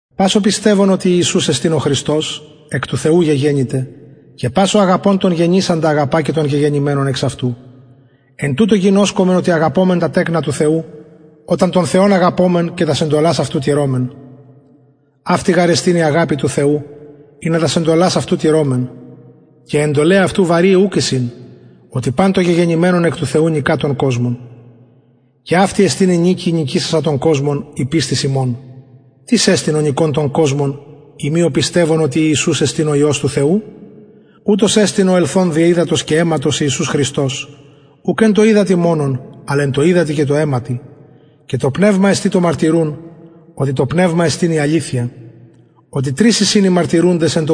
πας ο πιστευων οτι ιησους εστιν ο χριστος εκ του θεου γεγεννηται και πας ο αγαπων τον γεννησαντα αγαπα και τον γεγεννημενον εξ αυτου εν τουτω γινωσκομεν οτι αγαπωμεν τα τεκνα του θεου οταν τον θεον αγαπωμεν και τας εντολας αυτου τηρωμεν αυτη γαρ εστιν η αγαπη του θεου ινα τας εντολας αυτου τηρωμεν και αι εντολαι αυτου βαρειαι ουκ εισιν οτι παν το γεγεννημενον εκ του θεου νικα τον κοσμον και αυτη εστιν η νικη η νικησασα τον κοσμον η πιστις ημων τις εστιν ο νικων τον κοσμον ει μη ο πιστευων οτι ιησους εστιν ο υιος του θεου ουτος εστιν ο ελθων δι υδατος και αιματος ιησους χριστος ουκ εν τω υδατι μονον αλλ εν τω υδατι και τω αιματι και το πνευμα εστιν το μαρτυρουν οτι το πνευμα εστιν η αληθεια οτι τρεις εισιν οι μαρτυρουντες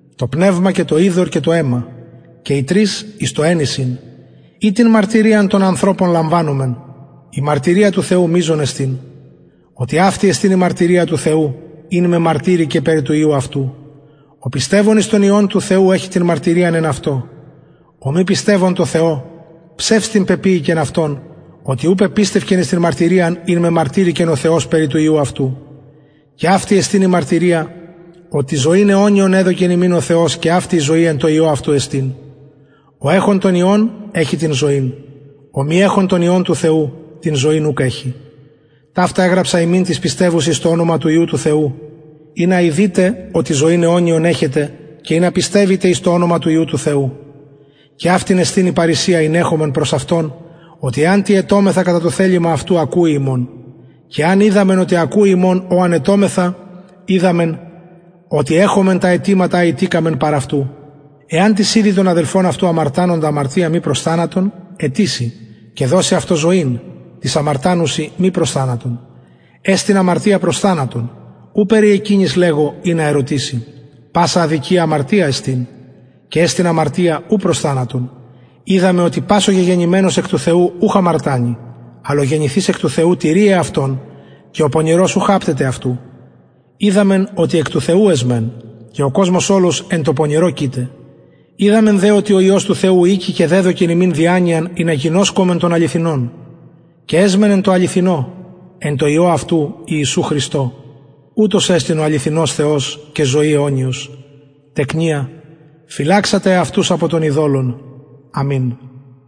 το πνευμα και το υδωρ και το αιμα και οι τρεις εις το εν εισιν ει την μαρτυριαν των ανθρωπων λαμβανομεν η μαρτυρια του θεου μειζων εστιν οτι αυτη εστιν η μαρτυρια του θεου ην μεμαρτυρηκεν περι του υιου αυτου ο πιστευων εις τον υιον του θεου εχει την μαρτυριαν εν αυτω ο μη πιστευων τω θεω ψευστην πεποιηκεν αυτον οτι ου πεπιστευκεν εις την μαρτυριαν ην μεμαρτυρηκεν ο θεος περι του υιου αυτου και αυτη εστιν η μαρτυρια οτι ζωην αιωνιον εδωκεν ημιν ο θεος και αυτη η ζωη εν τω υιω αυτου εστιν ο εχων τον υιον εχει την ζωην ο μη εχων τον υιον του θεου την ζωην ουκ εχει ταυτα εγραψα υμιν τοις πιστευουσιν εις το ονομα του υιου του θεου ινα ειδητε οτι ζωην αιωνιον εχετε και ινα πιστευητε εις το ονομα του υιου του θεου και αυτη εστιν η παρρησια ην εχομεν προς αυτον οτι εαν τι αιτωμεθα κατα το θελημα αυτου ακουει ημων και εαν οιδαμεν οτι ακουει ημων ο εαν αιτωμεθα οιδαμεν οτι εχομεν τα αιτηματα α ητηκαμεν παρ αυτου εαν τις ιδη τον αδελφον αυτου αμαρτανοντα αμαρτιαν μη προς θανατον αιτησει και δωσει αυτω ζωην τοις αμαρτανουσιν μη προς θανατον εστιν αμαρτια προς θανατον ου περι εκεινης λεγω ινα ερωτηση πασα αδικια αμαρτια εστιν και εστιν αμαρτια ου προς θανατον οιδαμεν οτι πας ο γεγεννημενος εκ του θεου ουχ αμαρτανει αλλ ο γεννηθεις εκ του θεου τηρει εαυτον και ο πονηρος ουχ απτεται αυτου οιδαμεν οτι εκ του θεου εσμεν και ο κοσμος ολος εν τω πονηρω κειται οιδαμεν δε οτι ο υιος του θεου ηκει και δεδωκεν ημιν διανοιαν ινα γινωσκωμεν τον αληθινον και εσμεν εν τω αληθινω εν τω υιω αυτου ιησου χριστω ουτος εστιν ο αληθινος θεος και ζωη αιωνιος τεκνια φυλαξατε εαυτα απο των ειδωλων αμην